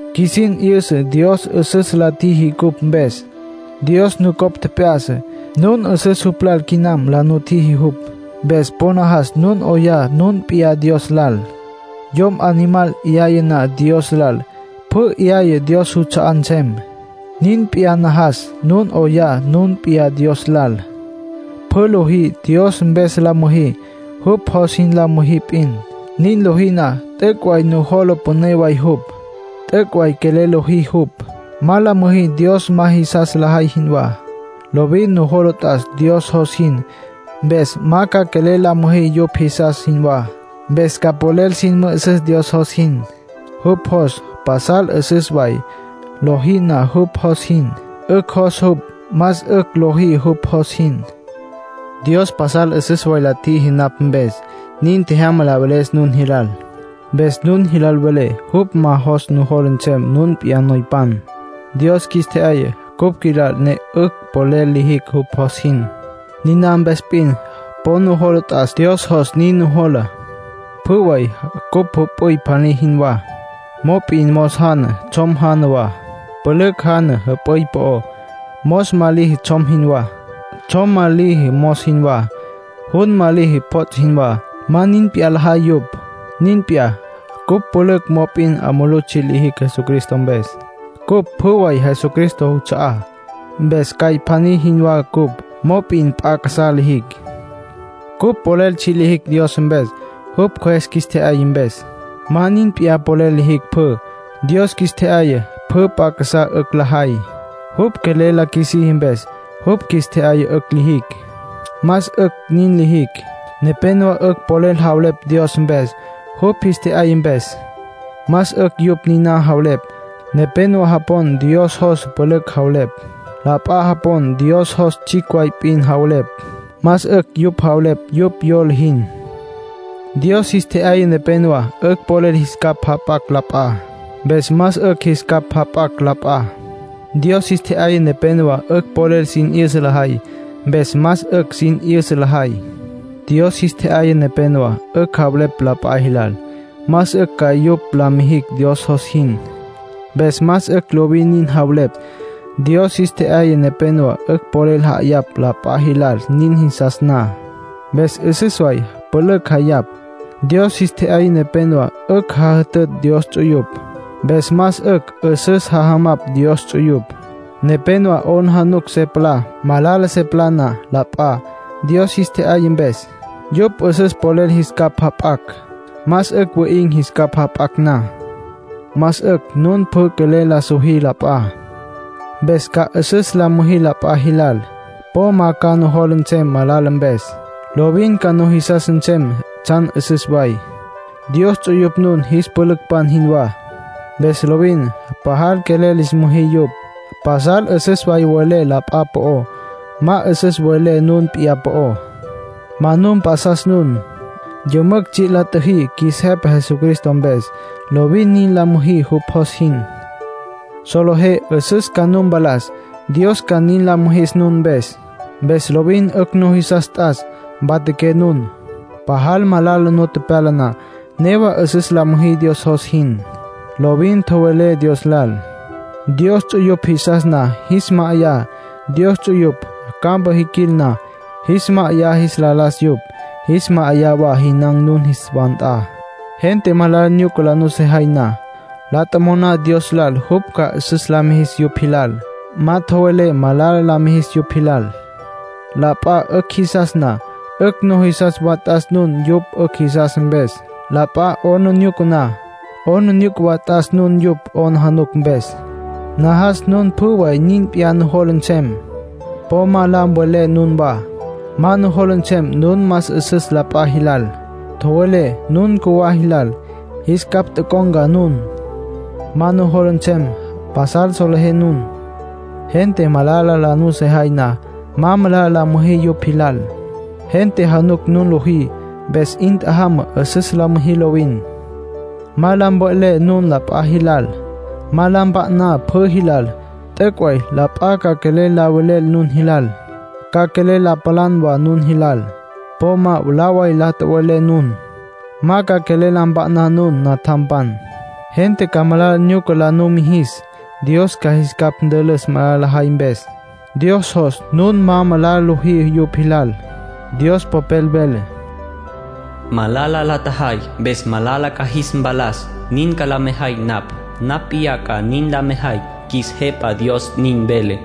Qjuisin 'yüsa Dios 'üsüs la tjiji cupj mpes. Dios nucopj tjep'ya'sa; nun 'üsüs jupj lal quinam la nutjiji jupj. Mpes po najas nun 'oyá nun p'iyá Dios lal. Yom animal 'yaya na Dios lal, pjü 'yaya, Dios juts'a'á nsem. Nin p'iyá, najas nun 'oyá nun p'iyá Dios lal. Pjü lojí, Dios mpes la müjí. Jupj jos jin la müjí p'in. Nin lojí na, t'üc' way nujola püné way jupj. T'üc' way quelel lojí jupj. Ma la müjí Dios ma jisas lajay jinwá. Lovin nujola t'as Dios jos jin, mpes ma ca quelel la müjí yupj jisas jinwá. Mpes ca polel sin mü'üsüs Dios jos jin. Jupj jos pasal 'üsüs way. Lojí na jupj jos jin, 'ücj jos jupj. Más 'ücj lojí jupj jos jin. Dios pasal 'üsüs way la tjiji napj mpes. Nin tjejyama la veles nun jilal. Mpes nun jilal velé jupj jos ma nujola nsem nun p'iyá noypan. Dios qjuis tje'yaya cupj qjuilal ne 'ücj polel lijicj jupj jos jin. Niná mpes p'in po nujola t'as. Dios jos nin nujola. Pjü way cupj jüp'üy pjaní jinwá. Mop'in mos jana, tsjom jana wa, pülücj jana jüp'üy po'ó. Mos ma liji tsjom jinwá. Tsjom ma liji mos jinwá. Jun ma liji pjots' jinwá. Ma nin p'iyá lajay yupj. Nin p'iyá, cupj pülücj. Mop'in 'a mulú tsji' lijicj Jesucristo mpes. Cupj pjü way Jesucristo juts'a'á, mpes cjay pjaní jinwá cupj. Mop'in p'a casá lijicj. Cupj polel tsji' lijicj Dios mpes, jupj Cjües qjuis tje'yaya mpes. Ma nin p'iyá polel lijicj pjü; Dios qjuis tje'yaya pjü p'a casá 'ücj lajay, jupj quelel la qjuisiji mpes. Jupj qjuis tje'yaya 'ücj lijicj, más 'ücj nin lijicj. Nepénowa 'ücj polel javelepj Dios mpes, jupj jis tje'yaya mpes. Más 'ücj yupj niná javelepj. Nepénowa japon Dios jos pülücj javelepj. La p'a japon Dios jos tsjicj way p'in javelepj. Más 'ücj yupj javelepj yupj yola jin. Dios jis tje'yaya nepénowa 'ücj polel jis capj jap'acj la p'a. Mpes más 'ücj jis capj jap'acj la p'a. Dios jis tje'yaya nepénowa 'ücj polel sin 'yüsa lajay. Mpes más 'ücj sin 'yüsa lajay. Dios jis tje'yaya nepénowa 'ücj javelepj la p'a jilal más 'ücj ca yupj la mijicj Dios jos jin. Mpes más 'ücj lovin nin javelepj. Dios jis tje'yaya nepénowa 'ücj polel ja'ayapj la p'a jilal nin jisas na. Mpes 'üsüs way pülücj ja'ayapj. Dios jis tje'yaya nepénowa 'ücj jajütütj Dios ts'uyupj. Mpes más 'ücj 'üsüs jajamapj Dios ts'uyupj. Nepénowa 'aplijila se palá, malala se palá na la p'a. Dios jis tje'yaya mpes, yupj 'üsüs polel jis capj jap'acj. Más 'ücj wi'in̈ jis capj jap'acj na. Más 'ücj nun pjü quelel la sojí la p'a. Mpes ca 'üsüs la müjí la p'a jilal. Po ma ca nujola nsem malala mpes. Lovin ca nujisas nsem tsjan 'üsüs way. Dios ts'uyupj nun jis pülücpan jinwá, mpes lovin pajal quelel lis müjí yupj. Pasal 'üsüs way mvelé la p'a po'ó. Ma 'üsüs mvelé nun p'iyá po'ó. Ma nu mpjasas nun. Yümücj tsji' la tjüjí qjuis Jepa Jesucristo mpes. Lovin nin la müjí jupj jos jin. Solejé 'üsüs ca nu mpalas, Dios ca nin la mijis nun mpes. Mpes lovin 'ücj nujisas t'as mpatjaqué nun. Pajal malala nu pyala na, newa 'üsüs la müjí Dios jos jin. Lovin tjowelé Dios lal. Dios ts'uyupj jisas na, jis ma'ayá. Dios ts'uyupj campa jiquil na, jis ma'ayá jis la las yupj, jis ma'ayá wa jinan̈ nun jis wa nt'a. Gente malala nyuca la nusejay na, la tjomoná Dios lal jupj ca 'üsüs la mijis yupj jilal. Ma tjowelé malala la mijis yupj jilal. La p'a 'ücj jisas na, 'ücj nujisas wa t'as nun yupj 'ücj jisas mpes. La p'a 'aplijila na, 'aplijila wa t'as nun yupj 'aplijila mpes. Najas nun pjü way nin p'iyá nujola nsem. Po ma la mve'lé nunwá. Ma nujola nsem nun más 'üsüs la p'a jilal. Tjowelé nun cjuwá jilal, jis capj tocon̈ca nun. Ma nujola nsem pasal solejé nun. Gente malala la nusejay na, ma malala la müjí yupj jilal. Gente januc nun lojí. Mpes 'in tjajama 'üsüs la müjí lovin. Ma la mve'lé nun la p'a jilal. Ma la mpa'ná pjü jilal. T'üc' way la p'a ca quelel la velel nun jilal. Ca quelel la palan wa nun jilal. Po ma mwalá way la tjowe'lé nun. Ma ca quelel la mpa'ná nun. Natjampan, gente ca malala nyuca la numijis. Dios ca jis capj ntülüs malala lajay mpes. Dios jos nun ma malala lojí yupj jilal. Dios Popel vele: “Malala la tjajay, mpes malala ca jis mpalas; nin ca la mejay napj. Napj p'iyá ca nin la mejay, qjuis Jepa Dios nin vele.”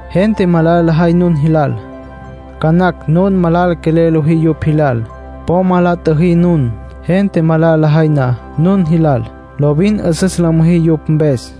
Gente malala lajay nun jilal. Ca nacj nun malala quelel lojí yupj jilal. ¡Po ma la tjüjí nun! Gente malala lajay na nun jilal, lovin 'üsüs la müjí yupj mpes.